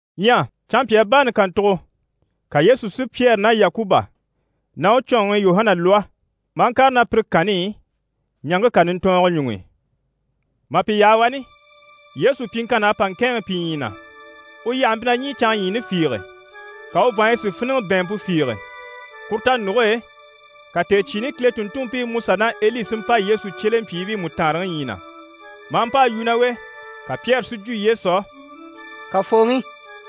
Ɲyɛ canmpyaa baani kàntugo, ka Yesu si Pyɛri ná Yakuba ná u cɔɔnŋi Yuhana lwɔ́, maa ŋkàre ná pire kanni i ɲaŋke kà nintɔɔngɔ ɲuŋ'i. Mà pi yaha wani, Yesu pyiŋkann'à pa ŋkɛ̂ɛnŋɛ pi ɲyii na. U yyahe mpyi na ɲî canŋa ɲyiini fiige, ka u vàanɲyi si fíniŋɛ bɛ̀ɛnmpe fiige. Kuru tanuge e, ka tèecyiini Kile tùnntunmpiiMusa ná Eli si mpa Yesu cyelempyiibii mú taanre ɲyii na, mà pa a yu ná u e. Ka Pyɛri si jwo Yesu á: «Kafooŋi,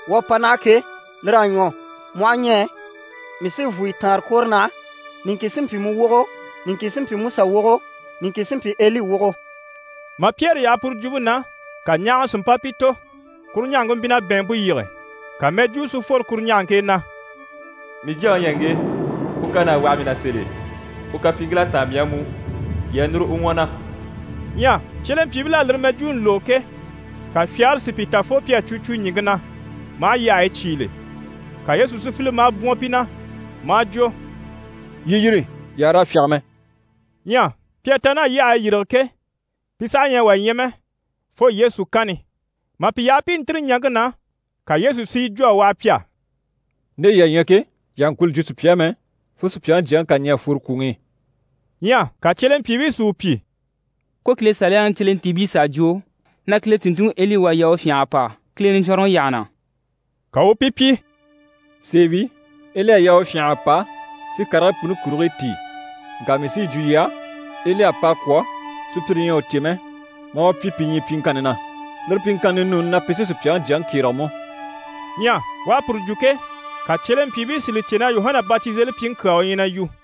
wuu à pa naha ke, lir'à ɲwɔ. Mu aha ɲɛɛ, mii sí vùnyɔ taanre kwòro naha, niŋkin sí n‑pyi mu wogo, niŋkin sí n‑pyi Musa wogo, niŋkin sí n‑pyi Eli wogo.» Mà Pyɛri yaha puru jwumpe na, ka ɲahaŋa si mpa pi tò, kuru ɲahaŋke mpyi na bɛ̀ɛnmpe yige. Ka mɛjwuu si fworo kuru ɲahaŋke e na: «Mii Jyaŋi u ɲyɛ ŋge, u kan'à waha mii na sèl'e, u kapyiiŋkil'à táan mii á mú, yii a núru u ɲwɔ na.» Ɲyɛ cyelempyiibil'à lire mɛjwuuni lógo ke, ka fyagare si pi ta fo pi à cwo cwo ɲìŋke na maa yyahayi cyígile. Ka Yesu si file maa bwɔ̀n pi na maa jwo: «Yii yîri, yii àha raa fyáge mɛ.» Ɲyɛ pi à ta naha yyahayi yîrige ke, pi saha ɲyɛ a wà ɲya mɛ fo Yesu kanni. Mà pi yaha pi i ntîri ɲaŋke na, ka Yesu si yi jwo a waha pi á: «Nde yii à ɲya ke, yii àha ŋkwɔ̀ li jwo sùpya á mɛ, fo Supyaŋi Jyaŋi ká ɲɛ̀ a fworo kwùŋi i.» Ɲyɛ ka cyelempyiibii si u pyi: «Ko Kile Saliyaŋi cyelentiibii s'à jwo na Kile tùnntunŋi Eli u à yaa u fyânha a pa Kile Niɲcwɔnrɔŋi yyaha na.» Ka u u pi pyi: «Sèe wi, Eli à yaa u fyânha a pa si karigii puni kurigii tíi. Ŋka mii sí yi jwo yii á, Eli à pa a kwɔ̀, sùpyire ɲyɛ a u cè mɛ, maa u pyi pi ɲyii pyiŋkanni na. Lire pyiŋkanni ninuuni na, pi sí Supyaŋi Jyaŋi kyérege mú.» Ɲyɛ u à puru jwo ke, ka u cyelempyiibii si li cè na Yuhana Batizelipyiŋi kyaa u ɲyɛ na yu.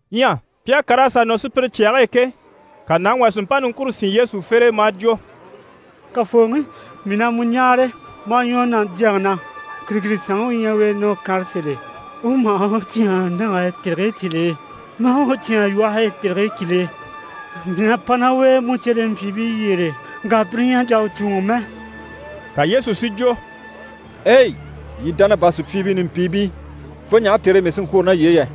Ɲyɛ pi à kàr'a sà nɔ sùpyire cyage e ke, ka nàŋi wà si mpa niŋkure sín Yesu fere e maa jwo: «Kafooŋi, mii na mu ɲáare maa ɲwɔ na jyaŋi na, kìrikirisanŋi u ɲyɛ u e na u kànre sèl'e, u maha u cyáan nage e tèrigii cyìl'e, maa u cyáan lwɔhe e tèrigii cyìl'e. Mii à pa ná u e mu cyelempyiibii yyére, ŋka pire ɲyɛ a jà a u cùuŋɔ mɛ.» Ka Yesu si jwo: «Ei! Yii dánabaa sùpyiibii nimpiibii, fo ɲaha tère e mii sí n‑kwôro ná yii e yɛ?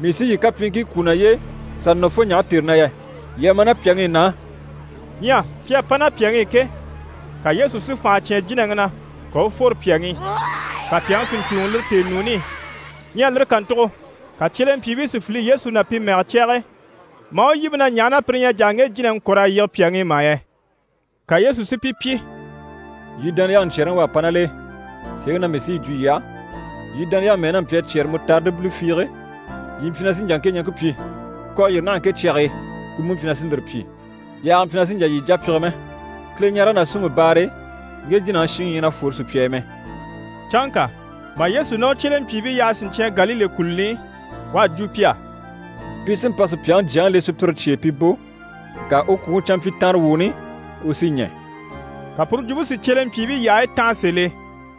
Mii sí yii kapyiiŋkii kwú naye e n-sà nɔ fo ɲaha tère na yɛ? Yii a ma ná pyàŋi i na á.» Ɲyɛ pi à pa ná pyàŋi i ke, ka Yesu si fànha cyán jínaŋi na, ka u u fworo pyàŋi i, ka pyàŋi si ɲcùuŋɔ lire tèenuuni i. Ɲyɛ lire kàntugo, ka cyelempyiibii si file Yesu na pi mɛgɛ cyage e maa u yíbe na ɲaha na pire ɲyɛ a jà a ŋge jínaŋi kɔ̀r'a yige pyàŋi i mà yɛ? Ka Yesu si pi pyi: «Yii dániyaŋi ɲcyɛ̀rɛŋi u à pa ná l'e. Sèeŋi na mii sí yi jwo yii á, yii dániyaŋi mɛ́ɛ n'a mpyi a cyɛ́rɛ mutaridi bile fiige, yii mpyi na sí n‑jà ŋke ɲaŋke pyi “Kò a yîri naha ŋke cyage e” ku mú mpyi na sí lire pyi. Yaaga mpyi na sì n‑jà yii jà pyige mɛ. [ Kileɲarege ná súnŋi baare e, ŋge jínaŋi shiŋi ɲyɛ na fwore sùpya e mɛ.]» Canŋka mà Yesu ná u cyelempyiibii yaha siɲcyan Galile kùluni i, u à jwo pi á: «Pi sí n‑pa Supyaŋi Jyaŋi le sùpyire cye e pi bò, ŋka u kwùŋi canmpyitanrewuuni, u sí ɲɛ̀.» Ka puru jwumpe si cyelempyiibii yyahayi tanha sèl'e.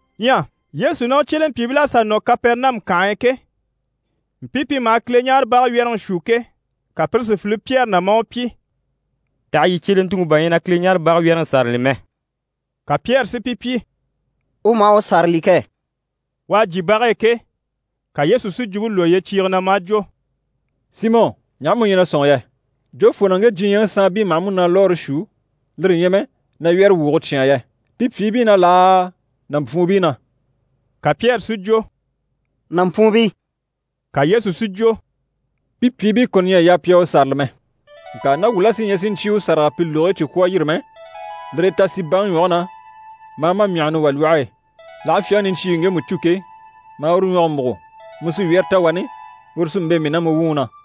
Ɲyɛ Yesu ná u cyelempyiibil'à sà nɔ Kapɛrɛnamu kànhe e ke, mpii pi maha Kileɲaarebage wyɛ́rɛŋi shuu ke, ka pire si file Pyɛri na maa u pyi: «Taha yii cyelentuŋi bà ɲyɛ na Kileɲaarebage wyɛ́rɛŋi sârali mɛ?» Ka Pyɛri si pi pyi: «U maha u sârali kɛ!» U à jyè bage e ke, ka Yesu si jwumpe lwɔ́ yyecyiige na, maa jwo: «Simɔ, ɲaha mu ɲyɛ na sɔ̂nŋi yɛ? Jofoo na ŋge diɲyɛŋi saanbii maha múnalwɔɔre shuu, lire ɲyɛ mɛ na wyɛ́rɛwwuuge cyáan yɛ? Pi pyìibii na laa, nàmpwuunbii na?» Ka Pyɛri si jwo: «Nàmpwuunbii.» Ka Yesu si jwo: «Pi pyìibii kɔni ɲyɛ a yaa pi a u sârali mɛ. Ŋka ná wuu la sí ɲyɛ sì ɲcyé u sâraga pi lùgigii cyi kwɔ̀ a yîri mɛ, lire e, ta sì baŋi ɲwɔge na, maa ma myàhani wà lwɔhe e. L'aha fyaŋi niɲcyiiŋi ŋgemu cû ke, maa uru ɲwɔge múgo, mu sí wyɛ́rɛ ta wani, uru sí n‑bɛ̂ mii ná mu wuŋi na.»